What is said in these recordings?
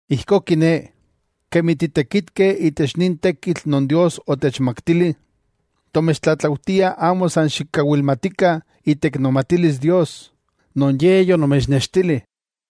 Ijkó kiné, kemi titekitkeh itech nin tekitl non Dios otechmaktili, tomechtlatlaujtiah amo san xikawilmatikah iteiknomatilis Dios, non Ye yonomechnextili.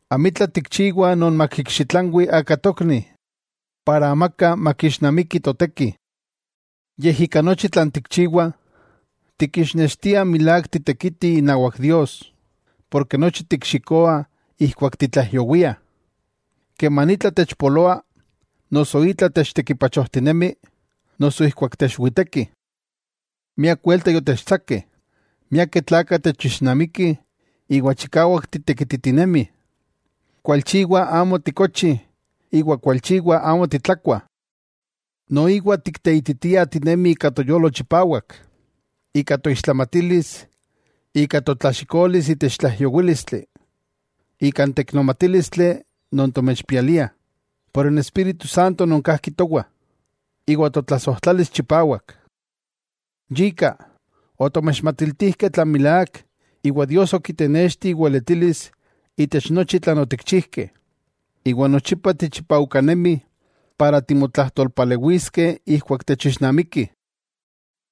Amitla tikchiwah non makikxitlanwi aka tokni, para amaka makixnamiki toteki. Yej ika nochi tlan tikchiwah, tikixnextiah milák titekitih inawak Dios, porke nochi tikxikoah ijkuak titlaijyowiah, keman itla techpoloa, noso itla techtekipachojtinemi, noso ijkuak techwitekih. Miak welta yotechtsakeh. Miakeh tlakah techixnamikih iwa chikawak titekititinemih. Kualchiwa amo tikochih iwa kualchiwa amo titlakuah. Noiwa tikteititiah tinemih ika toyolo chipawak, ika toixtlamatilis, ika totlaxikolis itech tlaijyowílistli, ika n teiknomatílistli non tomechpialiah, por n Espíritu Santo non kajki towah, iwa totlasojtlalis chipawak. Yika, otomechmachtijkeh tlan milák iwa Dios okitenexti iweletilis itech nochi tlan otikchijkeh. Iwa nochipa tichipaujkanemi para timotlajtolpalewiskeh ijkuak techixnamikih.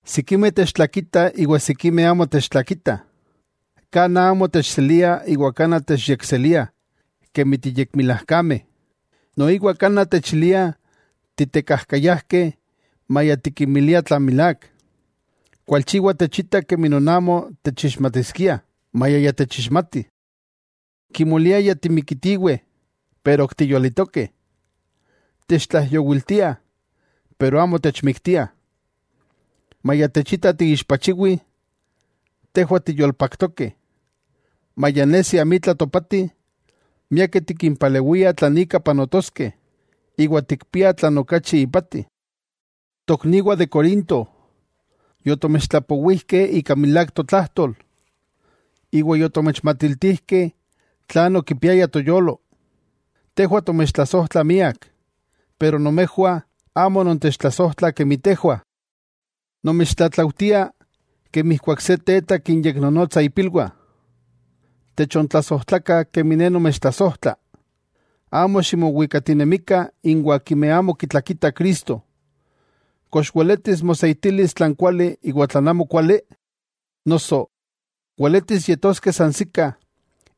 Sikimeh techtlakitah iwa sikimeh amo techtlakitah. Kanaj amo techseliah iwa kanaj techyekseliah kemi yekmilajkameh. Noiwa kanaj techiliah titekajkayajkeh maya tikinmiliah tlan milák. Kualchiwa techitah kemi non amo techixmatiskiah, maya ya techixmatih. Kimoliah ya timikitiweh, pero ok tiyolitokeh, techtlaijyowiltiah, pero amo techmiktiah. Maya techitah tiixpachiwih, tejwah tiyolpaktokeh, maya nesi amitla topatih, miakeh tikinpalewiah tlan ika panotoskeh, iwa tikpiah tlan okachi ipati. Tokniwah de Corinto, yotomechtlapowijkeh ika milák totlajtol, iwa yotomechmatiltijkeh tlan okipiaya toyolo. Tejwah tomechtlasojtlah miak. Pero nomejwah amo nontechtlasojtlah kemi tejwah. Nomechtlatlaujtia kemi ijkuak se teta kinyeknonotsa ipilwah: techontlasojtlakah kemi ne nomechtlasojtla. Amo ximowikatinemikah inwah akimeh amo kitlakitah Cristo. ¿Kox weletis moseitilis tlan kuali iwan tlan amokuali? Noso ¿weletis yetoskeh sansikah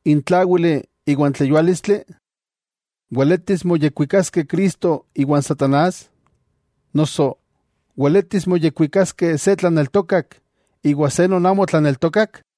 n tláwili iwa n tleyuálistli? ¿Weletis moyekwikaskeh Cristo iwan satanás? Noso ¿weletis moyekuikaskeh se tlaneltokak iwa se non amo tlaneltokak?